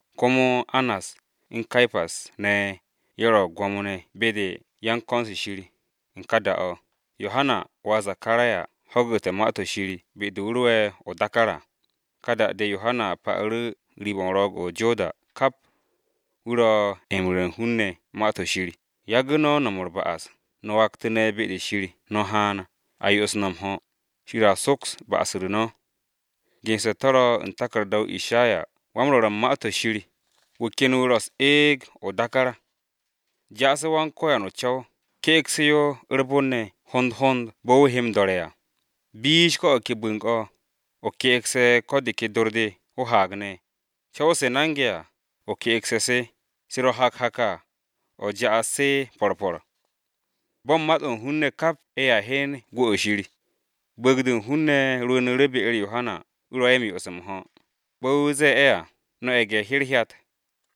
Komo Annas, u̱n Ke̱pas ne̱, ye̱ ro Gwo̱mo-ne̱ ye̱ u̱n ko̱n-se Shir. U̱n ka da-o̱, Yohana wà Zakaraya ho̱gu̱te̱ Ma-to̱ Shir be-de wu̱ ro'e̱ o-dákár à. Ka da-de Yohana pa'u̱ru̱ riib-o̱ o-ro̱o̱g o-Joda kap, wu̱ ro m-ru̱re̱ u̱n hun-ne̱ Ma-to̱ Shir, “Yagu̱ no̱ u̱r-ba'as, no̱ waktu̱ne̱ be-de Shir, no̱ haan, a yo'os no̱ m-ho̱, Shir a soks ba'as-u̱r no̱.” Gense̱ to̱ ro̱ u̱n taku̱rda-o Ishayawan-Rwo̱r u̱n Ma-to̱ Shir: “Wu̱ ken wu̱ ro̱ u̱s-eeg o-dákár. ‘Ja'ase̱ Yawe o-co̱w, ke'egse̱ yo u̱r-bon ne̱ hond hond bo̱ wu̱ he m-do̱re̱ à! Bish ko̱ o̱ ke bu̱ng-o̱, o ke'egse̱ ko̱ de ke dor-de o-haag ne̱. Co̱w-se nange̱ à, o ke'egse̱ se, se ro̱ hak hak à, o ja'as se po̱r po̱r. Bo̱ u̱n mat-o̱ u̱n hun-ne̱ kap ye̱a hyen gwu̱-o Shir!’” Bu̱u̱g-de u̱n hun-ne̱ rwu̱u̱nu̱ru̱ be-u̱r Yohana wu̱ yo'os ye̱ m-ho̱. Bo̱ wu̱ ze̱e̱ ye̱ à, “No̱ ye̱ge̱-herhyat!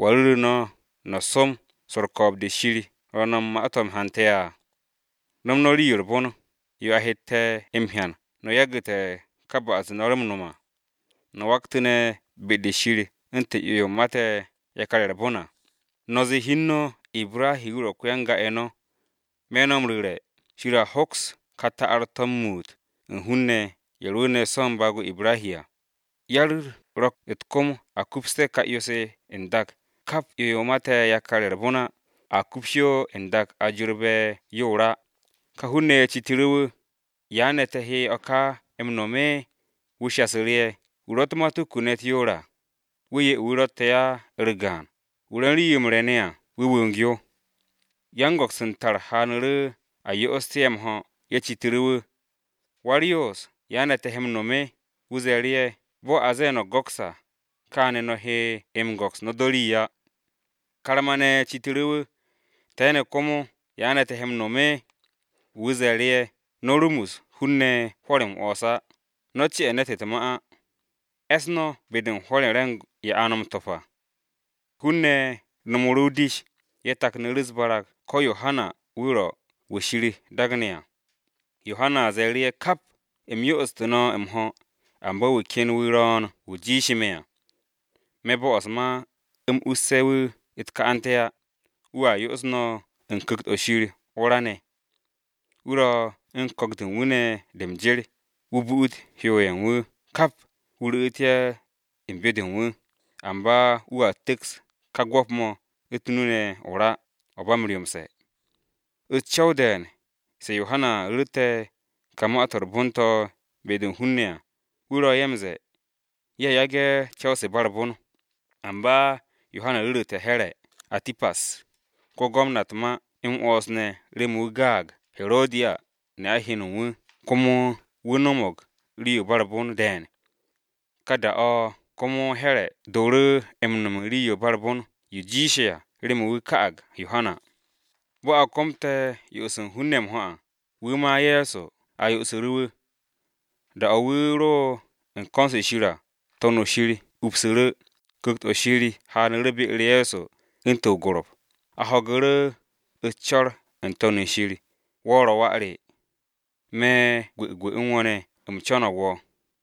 ¿Wa ru̱ru̱ no̱, no̱ som swo̱ u̱r-ko̱o̱b de Shir ro̱ no̱ u̱n ma-to̱ m-hante̱ à? No̱m no̱ rii-yo u̱r-bon, yo a hette̱ m-hyan no̱ yagu̱te̱ ka ba'as-de no̱ ro̱ m-no̱m à, no̱ waktu̱ne̱ be-de u̱n Shir u̱ntu̱n 'yo-yo mate̱ yakar-ye̱ u̱r-bon à. No̱ ze̱e̱ hi u̱n no̱ Ibrahi wu̱ ro̱ ko-yan-ga-ye̱ no̱. Me̱ no̱ m-ru̱re̱, Shir a hoks ka ta'ar-to̱ m-muut u̱n hun-ne̱ ye̱ rwu̱u̱ne̱ so̱ u̱n baag-o̱ Ibrahi à! Yar-u̱r ro̱ u̱t-kom a kupste̱ ka 'yo-se n-dak, kap 'yo-yo mate̱ yakar-ye̱ u̱r-bon á, a kups yo n-dak a jorbe̱ yo o-ra.” Ka hun-ne̱ ye̱ citu̱ru̱ wu̱, “¿Ya ne̱ te̱ he o̱ ka m-no̱m?” Wu̱ shasu̱ru̱ ye̱, “Wu̱ ro̱ u̱t-matuku ne̱ u̱t-yoor à, wu̱ 'ye wu̱ ro̱tte̱ á u̱r-gaan, wu̱ ro̱ u̱n rii-yo m-re̱ ne̱ à, wu̱ wong yo.” Yan-go̱ks u̱n tar haanu̱ru̱ a yo'oste̱ ye̱ m-ho̱, ye̱ citu̱ru̱ wu̱, “Wa-u̱r-Yoos, ¿ya ne̱ te̱ he m-no̱m?” Wu̱ ze̱e̱ru̱ ye̱, “Bo̱ a ze̱e̱ no̱ go̱ks à, kaane̱ no̱ he m-go̱ks no̱ do̱ rii á.” Karma-ne̱ citu̱ru̱ wu̱, “Te̱ ne̱ komo, ¿ya ne̱ te̱ he m-no̱m?” Wu̱ ze̱e̱ru̱ ye̱, “No̱ rumus hun-ne̱ hwo̱r m-'wo̱ns á, no̱ ce'e̱ ne̱t u̱t-ma á. E̱s no̱ be-de u̱n hwo̱r-ye̱ o-re̱ng ye̱ a no̱ m-to̱p à.” Hun-ne̱ no̱mu̱ru̱ o-dish, ye̱ taknu̱ru̱ u̱s-barag ko̱ Yohana wu̱ ro̱ Kiristi. Yohana ze̱e̱ru̱ ye̱ kap, “U̱m yo'ostu̱ no̱ m-ho̱, amba wu̱ ken wu̱ ro̱o̱n wu̱ jiishe̱ me̱ à. Me̱ bo'os ma u̱m usse̱ wu̱ u̱t-ka'ante̱ á. Wu̱a yo'os no̱ u̱n Ku̱kt-o̱ Shir o-ra ne̱. Wu̱ ro̱ u̱n ko̱k-de u̱n wu̱ ne̱ de m-jer, wu̱ bu'ut hyo-ye̱ u̱n wu̱ kap, wu̱ ru̱'u̱t ye̱ u̱n byo-de u̱n wu̱, amba wu̱a tu̱ks ka gwo̱p-mo̱ u̱t-nu ne̱ o-ra, o̱ ba m-ryomse̱.” U̱s-co̱w de̱e̱n, se Yohana ru̱rte̱ ka Ma-to̱ m-Re̱re̱m to̱ be-de u̱n hun-ne̱ à, wu̱ ro̱ ye̱ m-ze̱e̱ ye̱ yage̱ co̱w-se u̱n ba u̱r-bon. Amba Yohana ru̱ru̱te̱ Here̱ [Atipas] ko-Gwamna u̱t-ma m-'wo̱ns ne̱ remen wu̱ gaag Herodiya, ne'a heno u̱n wu̱, komo wu̱ no̱mo̱g rii-yo ba u̱r-bon de̱e̱n. Ka da-o̱ komo Here̱ dooru̱ m-no̱m u̱n rii-yo ba u̱r-bon yo jiishe̱ à, remen wu̱ ka'ag Yohana. Bo̱ a komte̱ yo'os u̱n hun-ne̱ m-ho̱ à, wu̱ ma Ye̱so a yo'osu̱ru̱ wu̱. Da-o̱ wu̱ ro u̱n ko̱n-se Shir à, To̱n-o shir upsu̱ru̱. Ku̱kt-o̱ Shir haanu̱ru̱ be-u̱r Ye̱so u̱ntu̱n o-tantabara. A ho̱gu̱ru̱ o-co̱r n-To̱n shir, “Wo̱ ro̱ wà re. Me̱ gwu̱gwu̱ u̱n wo̱ ne̱ u̱m co̱no̱g wo̱.”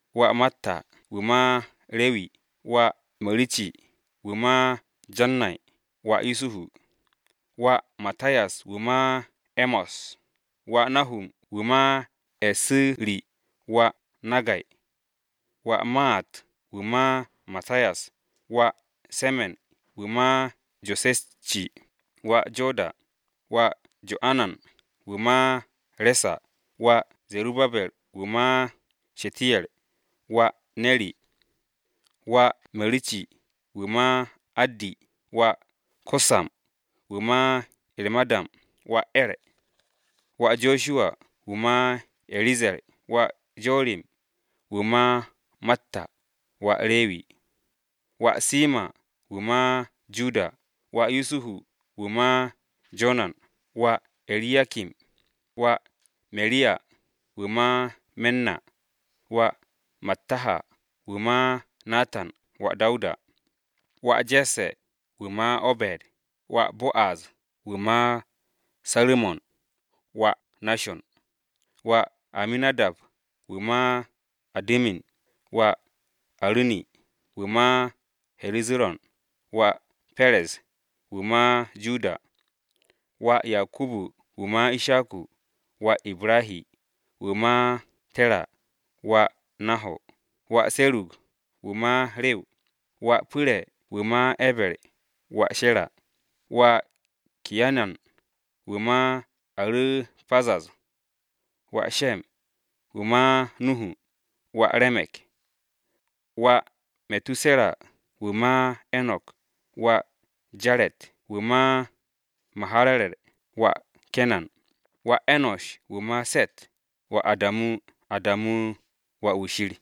Wà Matta wu̱ ma Rewi, wà Meru̱ci, wu̱ ma Jannay, wà Yusuhu. Wà Mattayas, wu̱ ma E̱mos, wà Nahum, wu̱ ma Esu̱ri, wà Naggay. Wà Maat, wu̱ ma Mattayas, wà Semen, wu̱ ma Jose̱ci, wà Joda. Wà Jo'anan, wu̱ ma Resa, wà Ze̱rubabe̱r, wu̱ ma Shetiyer, wà Neri. Wà Meru̱ci, wu̱ ma Addi, wà Kosam, wu̱ ma Ermadam, wà Er. Wà Josuwa, wu̱ ma Eriyazer, wà Jorim, wu̱ ma Matta, wà Rewi. Wà Simo̱n, wu̱ ma Yahuda, wà Yusuhu, wu̱ ma Jonan, wà E̱riyakim. Wà Mereya, wu̱ ma Menna, wà Mattaha, wu̱ ma Natan, wà Dawuda. Wà Je̱sse̱, wu̱ ma Obe̱d, wà Bo'az, wu̱ ma Saru̱mon, wà Nashon. Wà Aminadab, wu̱ ma Adu̱min, wà Aru̱ni, wu̱ ma He̱zu̱ron, wà Perez, wu̱ ma Yahuda. Wà Yakubu, wu̱ ma Ishaku, wà Ibrahi, wu̱ ma Tera, wà Naho̱r. Wà Se̱rug, wu̱ ma Riw, wà Pu̱re̱, wu̱ ma E̱ber, wà Shera. Wà Kayinan, wu̱ ma Aru̱pazad, wà Shem, wu̱ ma Nuhu, wà Ramek. Wà Me̱tuse̱ra, wu̱ ma Enok, wà Jaret, wu̱ ma Mahararer, wà Kenan. Wà E̱no̱sh, wu̱ ma Shitu, wà Adamu, Adamu wà-wu̱ Shir.